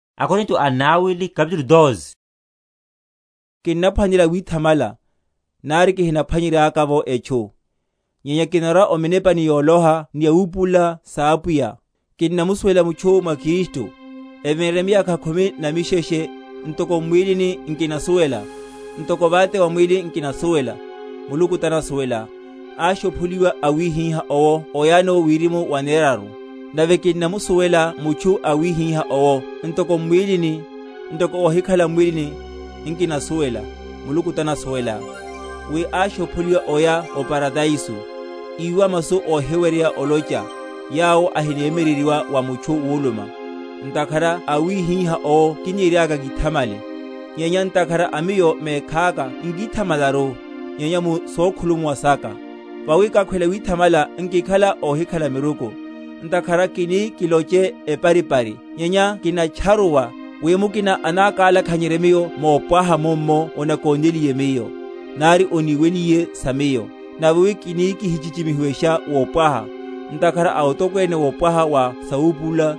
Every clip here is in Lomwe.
Yawoneya ya wirimu, ni mwíwa m’mwílini mwawe. Kinnaphwanela withamala, nari kihiphwanyer?-?yaka’vo etchu; nyenya kinarwa o minepani yoloha ni sawupulula sa Apwiya. Nkinamusuwela mutchu mwa Kristu, evinre miyakha khumi na misheshe (ntoko m’mwílini, nkinasuwela; ntoko vate va mwíli, nkinasuwela; Muluku tanasuwela), áshopholiwa awihiha owo oyano wirimu waneraru. Nave kinnamusuwela mutchu awihiha owo (ntoko m’mwílini, ntoko óhikhala m’mwílini, nkinasuwela; Muluku tanasuwela), wi áshopholiwa oya o Paradaiso, íwa masu óhiweryeya olocheya, yawo ahinemyeryeryiwa wa mutchu wulummwa. Ntakhara a awihiha owo kiniriaka kíthamale; nyenya ntakhara a miyo mekhaka nkithamalaru, nyenya mu sokhulumuwa saka. Vawi kakhwela withamala, nkikhala óhikhala miruku; ntakhara kini kiloche eparipari; nyenya kinatcharuwa, wi mukina anakalakhanyerye miyo mopwaha mummo onakónéliye miyo, nari oniweliye sa miyo. Nave wi kini kihichichimihiwesha wopwaha, ntakhara a otokwene wopwaha wa sawupulula,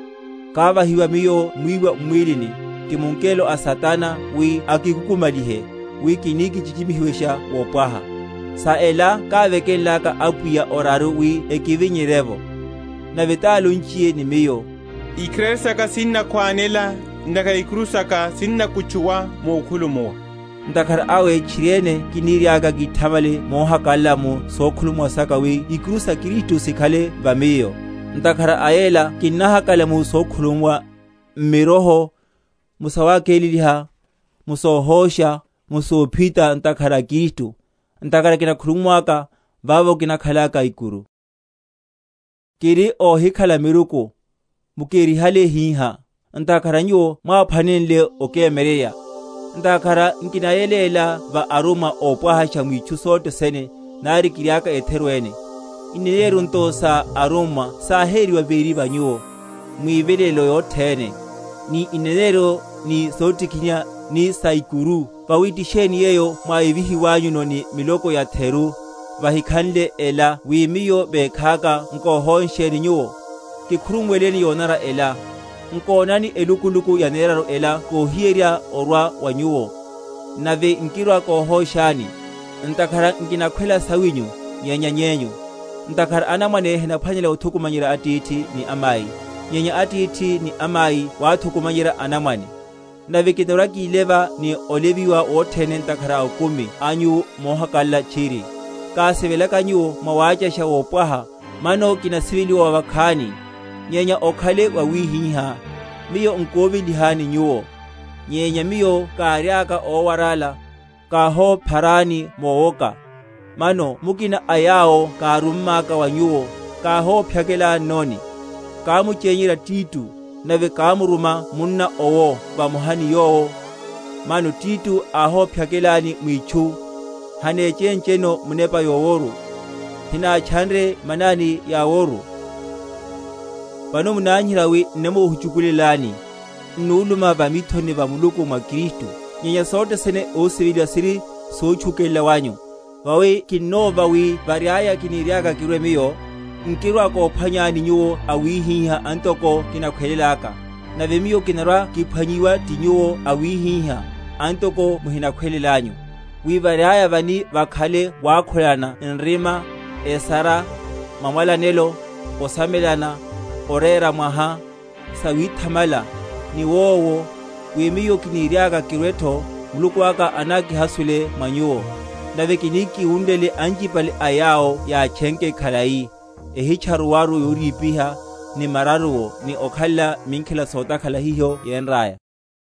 kávahiwaka miyo mwíwa m’mwílini, ti mungelo a Satana wi akikukumalihe, wi kini kichichimihiwesha wopwaha. Sa ela kávekenlaka Apwiya oraru wi ekivinyerye’vo. Nave tálonchiye ni miyo, Ikharari saka sinnokhwanela; ntakhara ikuru saka sinakutchuwa mukhulumuwa. Ntakhara awe tchiriene kiniriaka kíthamale mohakalala mu sokhulumuwa saka, wi ikuru sa Kristu sikhale va miyo. Ntakhara a yela kinnahakalala mu sokhulumuwa, m’miroho, mu sawakeleliha, mu sohósha, mu sophita, ntakhara a Kristu; ntakhara kinakhulumuwaka, vavo kinakhalaka ikuru. Ohisivela wawe wa Paulo. Kiri óhikhala miruku, mukerihale hihá; ntakhara nyuwo mwáphwanenle okemyeryerya; ntakhara nkinayeléla va arummwa ópwahasha mwitchu sothe sene, nari kiriaka etheru ene. Ineneryo nto sa arummwa sáheriwa véri vanyu, mwivilelelo yothene, ni ineneryo, ni sotikiniha, ni saikuru. Vawi ti sheni yeyo mwáyevihiwanyuno ni miloko yatheru, yahikhanle ela wi miyo mekhaka nkohónsheni nyuwo? Kikhurumuweleni yonanara ela. Nkonani, elukuluku yaneraru ela kohiryeherya orwa wa nyuwo, nave nkirwa‐kohóshani; ntakhara nkinakhwela sawinyu, nyenya nyenyu; ntakhara anamwane henaphwanela othukumanyerya atithi ni amai, nyenya atithi ni amai wathukumanyerya anamwane. Nave kinarwa‐kíleva ni oleviwa wothene ntakhara a okumi anyu mohakalala tchiri. Kásivelaka nyuwo mwawácha wopwaha, mano kinasiveliwa wavakhani? Nyenya okhale wawihihá; miyo nkovelihaleni nyuwo; nyenya miyo káriaka ówarála, káhopharani mowoka. Mano mukina a yawo kárummaka wa nyuwo, káhophyakelannoni? Kámuchenyerya Tito, nave kámuruma munna owo vamoha ni yowo. Mano Tito áhophyakelani mwitchu? Hanéchéncheno Munepa yoworu? Hinátchanre manani yaworu? Mathoriheryo ókutchula. Solányana. Vano munanyiherya wi n’namohuchukulelani. N’nuluma va mithoni va Muluku mwa Kristu. Nyenya sothe sene, ósiveliwa, siri sotchukelela wanyu. Vawi kinnova, wi variaya, kiniriaka kirwe miyo, nkirwa‐kophwanyani nyuwo awihiha antoko kinakhwelelaka, nave miyo kinarwa‐kiphwanyiwa ti nyuwo awihiha antoko muhinakhwelelanyu; wi variaya vani vakhale wákhulana nrima, esara, mamwalanelo, osomelana, orera mwaha, sawithamala, niwowo; wi miyo kiniriaka kirwetho, Muluku aka anákihasule mwa nyuwo, nave kini kiwunlele anchipale a yawo yátchenke khalai, ehitcharuwaru yorípiha, ni mararuwo, ni okhalela minkhela sotakhala hiho yénraya.